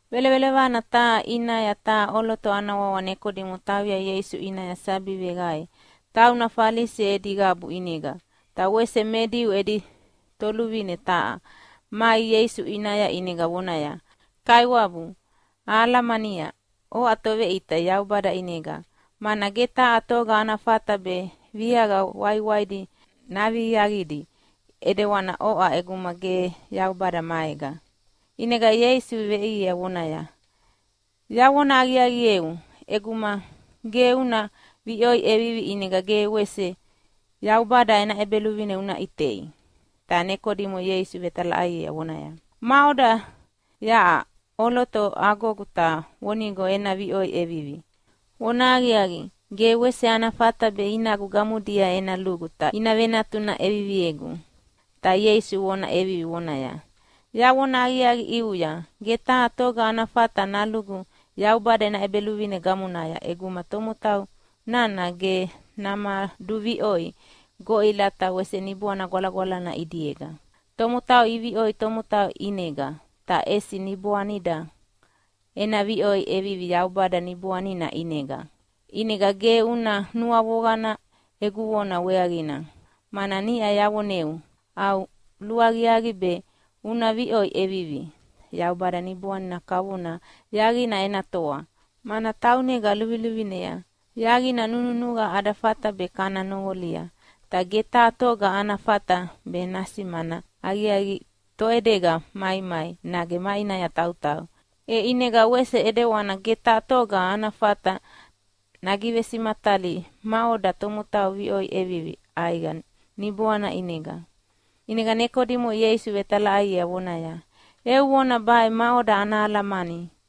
Velovelovana taha ʼinaya taha ʼoloto ana wawa Nekodimo tauya Ieisu ʼinaya sabi veqae. Tauna Falisi edi qabu ʼinega, ta wese me Diu edi toluvine taha. Mai Ieisu ʼinaya ʼinega vonaya, “Kaiwabu, ahalamania oʼa Toveʼita Yaubada ʼinega, mana ge taha toga ana fata be viaqa waiwaidi naviaqidi ʼidewana oʼa ʼeguma ge Yaubada maega.” ʼInega Ieisu veʼiea vonaya, “Yavona aqiaqieu, ʼeguma ge una viʼoi ʼevivi ʼinega ge wese Yaubada ena ʼEbeluvine una ʼitei.” Ta Nekodimo Ieisu vetalaʼaiea vonaya, “Maʼoda yaʼa ʼoloto agogu ta vonigo ena viʼoi ʼevivi? Vonahaqiaqi, ge wese ana fata be inagu gamodia ena lugu ta ina venatuna ʼeviviegu.” Ta Ieisu vona ʼeviviea vonaya, “Yavona aqiaqi ʼiuya, ge taha toga ana fata nalugu Yaubada ena ʼEbeluvine gamonaya ʼeguma tomotau nana ge namaduviʼoi goʼila ta wese Niboana Gwalagwalana ʼidiega. Tomotau iviʼoi tomotau ʼinega, ta ʼesi niboanida ena viʼoi ʼevivi Yaubada Niboanina ʼinega. ʼInega ge una nuavoqana egu vona weaqina, mana niʼa yavoneu au luaqiaqi be una viʼoi ʼevivi. Yaubada Niboanina kavona yaqina ena toa, mana taunega luviluvinea. Yaqina nununuqa ada fata be kana noqolia, ta ge taha toga ana fata be nasimana aqiaqi toʼedega maimai nage maʼinaya tautauya. E ʼinega wese ʼidewani ge taha toga ana fata nagivesimatalia maʼoda tomotau iviʼoi ʼevivi ʼaiqa Niboana ʼinega.” ʼInega Nekodimo Ieisu vetalaʼaiea vonaya, “Eu vona baʼe maʼoda ana alamani?”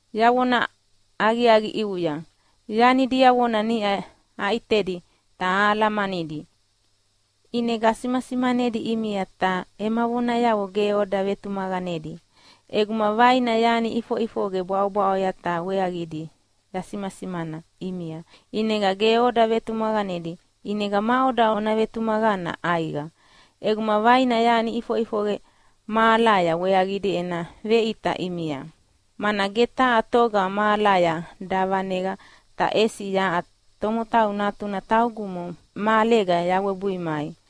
Yavona aqiaqi ʼiuya, yani diavona niʼa aʼitedi ta ahalamanidi, ʼinega asimasimanedi ʼimia, ta ema vonayavo ge oda vetumaqanedi. ʼEguma vaina yani iʼifoʼifoqe bwaʼobwaʼoya ta weaqidi yasimasimana ʼimia ʼinega ge oda vetumaqanedi, ʼinega maʼoda ona vetumaqana ʼaiqa ʼeguma vaina yani iʼifoʼifoqe mahalaya weaqidi ena veʼita ʼimia? Mana ge taha toga mahalaya davaneqa, ta ʼesi yaʼa Tomotau Natuna taugumo mahalega yawebui mai.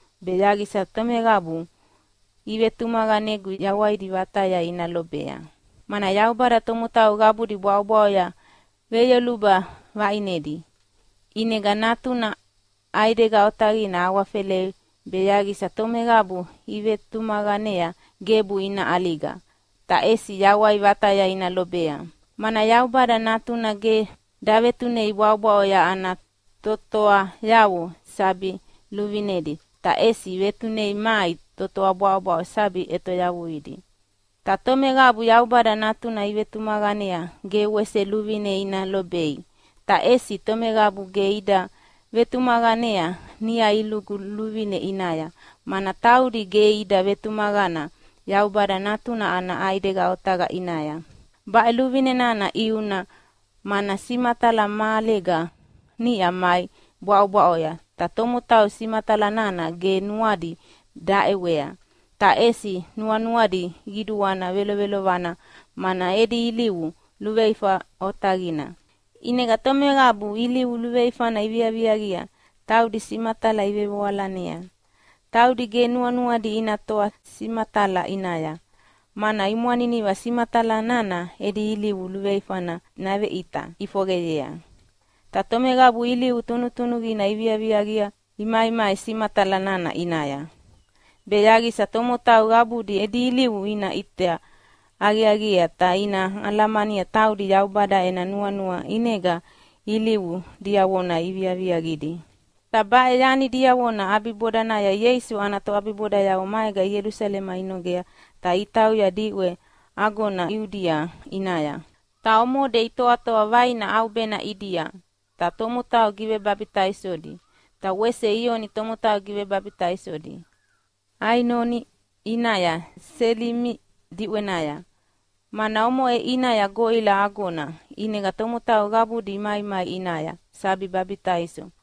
be yaqisa tomeqabu ivetumaqanegu yawaidi vataya ina lobea. Mana Yaubada tomotau qabudi bwaʼobwaʼoya veyoluba vaʼinedi, ʼinega Natuna ʼaidega otaqina awafelea be yaqisa tomeqabu ivetumaqanea gebu ina ʼaliga, ta ʼesi yawai vataya ina lobea. Mana Yaubada Natuna ge davetunei bwaʼobwaʼo ana totoayavo sabi luvinedi, ta ʼesi vetunei mai totoa bwaʼobwaʼo sabi ʼetoyavuidi. “Ta tomeqabu Yaubada Natuna ivetumaqanea ge wese luvine ina lobei, ta ʼesi tomeqabu ge ida vetumaqanea niʼa ilugu luvine ʼinaya, mana taudi ge ida vetumaqana Yaubada Natuna ana ʼaidega otaqa ʼinaya. Baʼe luvine nana ʼiuna, mana simatala mahalega niʼa mai bwaʼobwaʼoya, ta tomotau simatala nana ge nuadi daʼewea, ta ʼesi nuanuadi qiduana velovelovana, mana edi ilivu luveifa otaqina. ʼInega tomeqabu ilivu luveifana iviaviaqia taudi simatala ivevoalanea. Taudi ge nuanuadi ina toa simatala ʼinaya, mana imwaniniva simatala nana edi ilivu luveifana naveʼita ʼifoqeyea. Ta tomeqabu ilivu tunutunuqina iviaviaqia imaimai simatala nana ʼinaya, be yaqisa tomotau qabudi edi ilivu ina ʼita aqiaqiea ta ina alamania taudi Yaubada ena nuanua ʼinega ilivu diavona iviaviaqidi.” Ta baʼe yani diavona ʼabibodanaya Ieisu ana toʼabibodayavo maega Ielusalema inogea ta itauya diʼwe agona Iudia ʼinaya. Ta omode itoatoa vaina ʼaubena ʼidia, ta tomotau givebabitaisodi. Ta wese Ioni tomotau givebabitaisodi Ainoni ʼinaya Selimi diʼwenaya, mana omoʼe ʼinaya goʼila agona. ʼInega tomotau qabudi imaimai ʼinaya sabi babitaiso.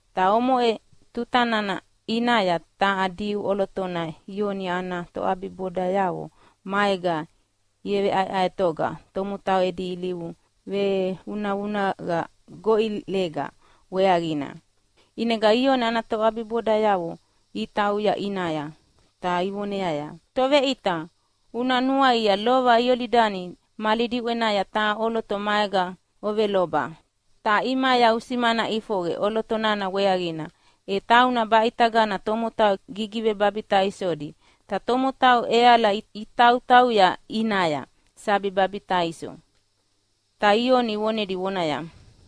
Ta omoʼe tuta nana ʼinaya taha Diu ʼolotona Ioni ana toʼabibodayavo maega iveʼaeʼaetoga tomotau edi ilivu vevunavunaqa goʼilega weaqina. ʼInega Ioni ana toʼabibodayavo itauya ʼinaya, ta ivoneaya, “Toveʼita, una nuaia, lova Iolidani mali diʼwenaya taha ʼoloto maega oveloba, ta ʼimaya usimana ʼifoqe ʼoloto nana weaqina. E tauna baʼitagana tomotau gigivebabitaisodi, ta tomotau ʼeala itautauya ʼinaya sabi babitaiso.” Ta Ioni vonedi vonaya,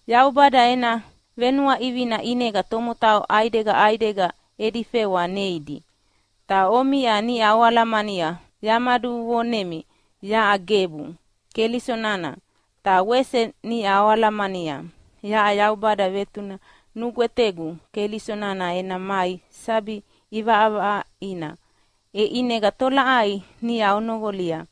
“Yaubada ena venuaʼivina ʼinega tomotau ʼaidega ʼaidega edi fewa neidi. Ta omiʼa niʼa oalamania lova yamaduvonemi yaʼa gebu Keliso nana. Ta wese niʼa oalamania yaʼa Yaubada vetune nugwetegu Keliso nana ena mai sabi ʼivaʼavaʼaina. E ʼinega tolaʼai niʼa onoqolia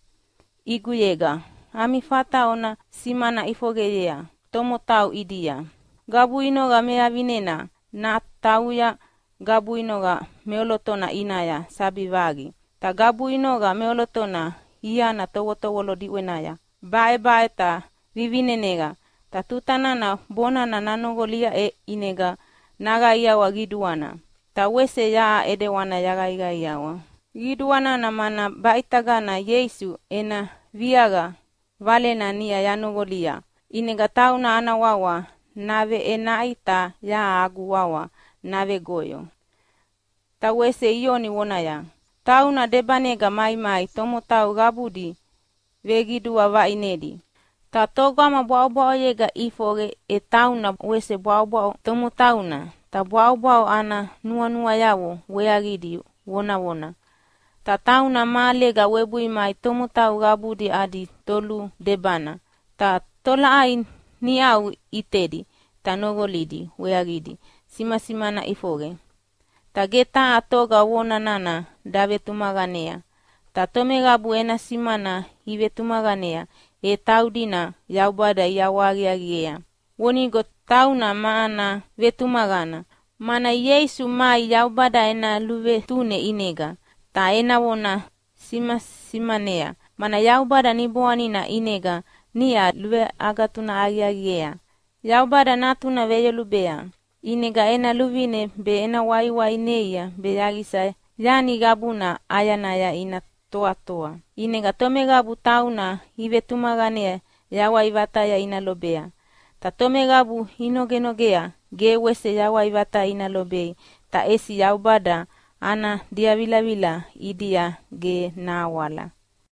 ʼiguyega ami fata ona simana ʼifoqeyea tomotau ʼidia. Gabuinoqa mevavinena natauya gabuinoqa meʼolotona ʼinaya sabi vaqi. Ta gabuinoqa meʼolotona iana tovotovolo diʼwenaya baʼebaʼe ta vivineneqa, ta tuta nana bonana nanoqolia, e ʼinega naqaiawa qiduana. Ta wese yaʼa ʼidewana yaqaiqaiawa qiduana, mana baʼitagana Ieisu ena viaqa valena niʼa yanoqolia. ʼInega tauna ana wawa naveʼenaʼi, ta yaʼa agu wawa navegoyo.” Ta wese Ioni vonaya, “Tauna debanega maimai tomotau qabudi veqidua vaʼinedi. Ta togama bwaʼobwaʼoyega ʼifoqe e tauna wese bwaʼobwaʼo tomotauna, ta bwaʼobwaʼo ana nuanuayavo weaqidi vonavona. Ta tauna mahalega webui mai tomotau qabudi adi toludebana, ta tolaʼai niʼau ʼitedi ta noqolidi weaqidi simasimana ʼifoqe, ta ge taha toga vona nana davetumaqanea. Ta tomeqabu ena simana ivetumaqanea, e taudina Yaubada iʼawahaqiaqiea vonigo tauna ma ana vetumaqana. Mana Ieisu mai Yaubada ena luvetune ʼinega, ta ena vona simasimanea, mana Yaubada Niboanina ʼinega niʼa luveagatunaʼi aqiaqiea. Yaubada Natuna veyolubea, ʼinega ena luvine be ena waiwai neia be yaqisa yani qabuna ʼayanaya ina toatoa. ʼInega tomeqabu tauna ivetumaqanea yawai vataya ina lobea. Ta tomeqabu inogenogea ge wese yawai vataya ina lobei. Ta ʼesi Yaubada ana diavilavila ʼidia ge nahawala.”